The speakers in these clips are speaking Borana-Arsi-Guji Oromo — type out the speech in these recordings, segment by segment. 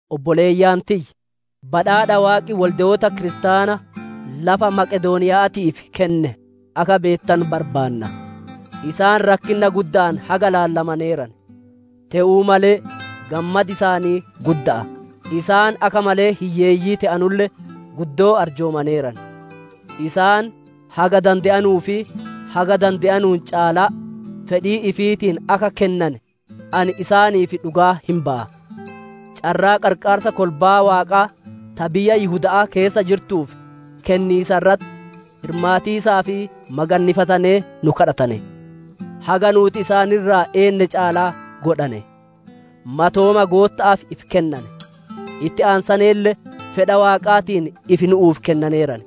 Obboleeyyan tiyya! Badhaadha Waaqi wolde'oota kiristaana lafa Maqedooniya'aatiif kenne akka beettanu barbaanna. Isaan rakkinna gudda'aan haga ilaallamaneeran; te'uu malee gammadi isaanii gudda'a; isaan akka malee hiyyeeyyii te'anulle, guddoo arjoomaneeran. Isaan haga dande'anuu fi haga dande'anuun caalaa, fedhii ifiitiin akka kennane ani isaaniif dhugaa hin baya. Carraa qarqaarsa kolbaa Waaqaa ta biyya Yihuda'aa keessa jirtuuf kenniisa irratti hirmaatiisaaf magannifatanee nu kadhatane; haga nuuti isaan irraa eenne caalaa godhane; matooma Gootta'aaf ifi kennane; itti aansaneelle fedha Waaqaatiin ifi nu'uuf kennaneeran.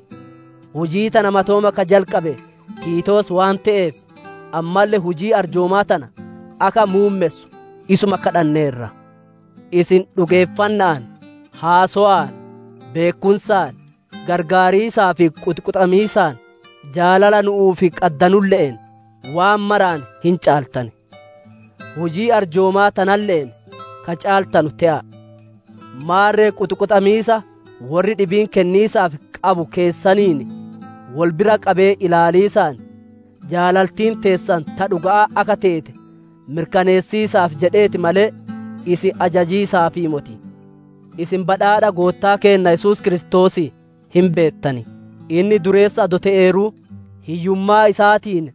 Hujii tana matooma ka jalqabe Tiitoos waan te'eef, ammalle hujii arjoomaa tana akka muummessu isuma kadhanneerra. Isin dhugeeffanna'aan, haasowaan, beekkumsaan, qarqaariisaaf quxiquxamiisaan, jaalala nu'uuf qaddanulle'een waan maraan hin caaltan; hujii arjoomaa tanalle'een ka caaltanu te'a. Maarre quxiquxamiisa worri dhibiin kenniisaaf qabu keessaniin wol bira qabee ilaaliisaan, jaalaltiin teessan ta dhuga'aa akka teete mirkaneessiisaaf jedheeti malee, isin ajajiisaafii moti. Isin badhaadha Goottaa keenna Yesuus Kiristoosii hin beettan; inni dureessa adoo te'eeruu, hiyyummaa isaatiin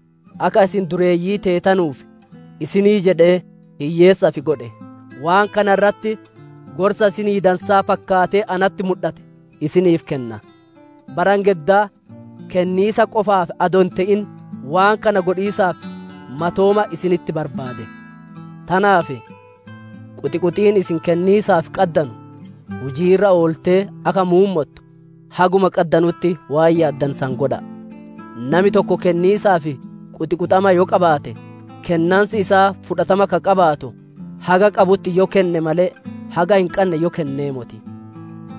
akka isin dureeyyii teetanuuf isinii jedhee hiyyeessa ifi godhe. Waan kana irratti gorsa isinii dansaa fakkaatee natti mudhate isiniif kenna: Bara engeddaa kenniisa qofaaf adoo hin te'in, waan kana godhiisaaf matooma isinitti barbaade. Tanaaf quxiquxiin isin kenniisaaf qaddanu hujii irra ooltee akka muummottu, haguma qaddanutti waan yaaddane san godha'a. Nami tokko kenniisaaf quxiquxama yoo qabaate, kennansi isaa fudhatama ka qabaatu, haga qabutti yoo kenne malee, haga hin qanne yoo kennee moti.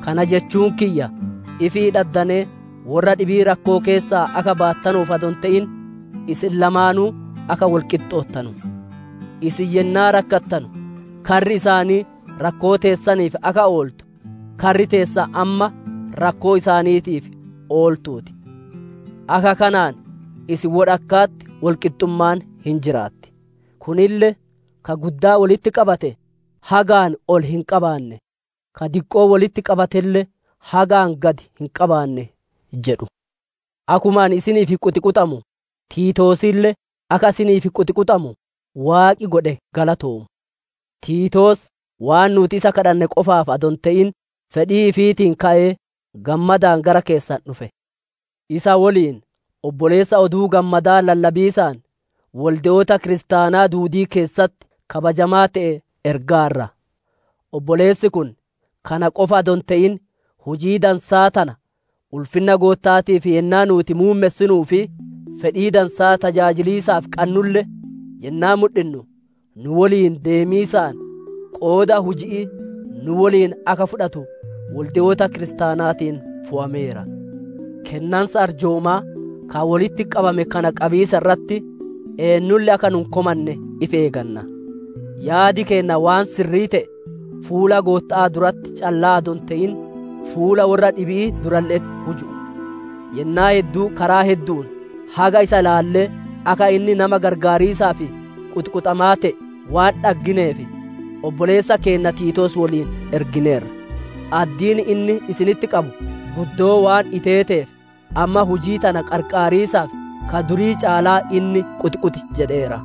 Kana jechuun kiyya ifii dhaddanee worra dhibii rakkoo keessaa akka baattanuuf adoo hin te'in, isin lamaanuu akka wol qixxoottanu. Isin yennaa rakkattanu karri isaanii rakkoo teessaniif akka ooltu, karri teessan amma rakkoo isaaniitiif ooltuu ti. Akka kanaan isin wodhakka'atti wol qixxummaan hin jiraatti. Kunille akkuma Barreeffami Woyyichi, «Ka guddaa wolitti qabate hagaan ol hin qabaanne, ka diqqoo wolitti qabatelle hagaan gad hin qabaanne» jedhu. Akkuma ani isiniif quxiquxamu, Tiitoosille akka isiniif quxiquxamu Waaqi godhe galatoomu. Tiitoos waan nuuti isa kadhanne qofaaf adoo hin te'in, fedhii ifiitiin ka'ee gammadaan gara keessan dhufe. Isa woliin obboleessa Oduu Gammadaa lallabiisaan wolde'oota kiristaanaa duudii keessatti kabajamaa te'e ergaarra. Obboleessi kun kana qofa adoo hin te'in, hujii dansaa tana ulfinna Gootta'aatiif yennaa nuuti muummessinuu fi fedhii dansaa tajaajiliisaaf qannulle yennaa mudhinnu, nu woliin deemiisaan qooda huji'ii nu woliin akka fudhatu wolde'oota kiristaanaatiin fowameera. Kennansa arjoomaa ka wolitti qabame kana qabiisa irratti eennulle akka nu hin komanne ifi eeganna. Yaad keenna waan sirrii te'e fuula Gootta'aa duratti callaa adoo hin te'in, fuulaa worra dhibi'ii durale'etti huju'u. Yennaa hedduu karaa heddu'uun haga isa ilaallee, akka inni nama qarqaariisaaf quxiquxamaa te'e waan dhaggineef obboleessa keenna Tiitoos woliin ergineerra; addiin inni isinitti qabu guddoo waan iteeteef, amma hujii tana qarqaariisaaf ka durii caalaa inni quxiquxi jedheera.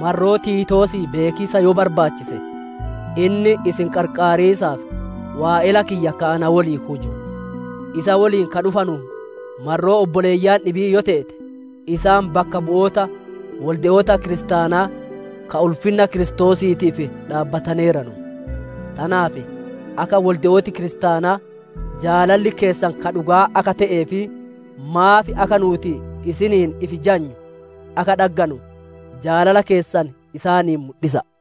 Marroo Tiitoosii beekiisa yoo barbaachise, inni isin qarqaariisaaf waa'ela kiyya ka na woliin huju; isa woliin ka dhufanu marroo obboleeyyan dhibi'ii yoo teete, isaan bakka bu'oota wolde'oota kiristaanaa ka ulfinna Kiristoosiitiif dhaabbataneeranu. Tanaaf akka wolde'ooti kiristaanaa jaalalli keessan ka dhuga'aa akka te'ee fi maaf akka nuuti isiniin ifi jajnu akka dhagganu, jaalala keessan isaanii mudhisa'a.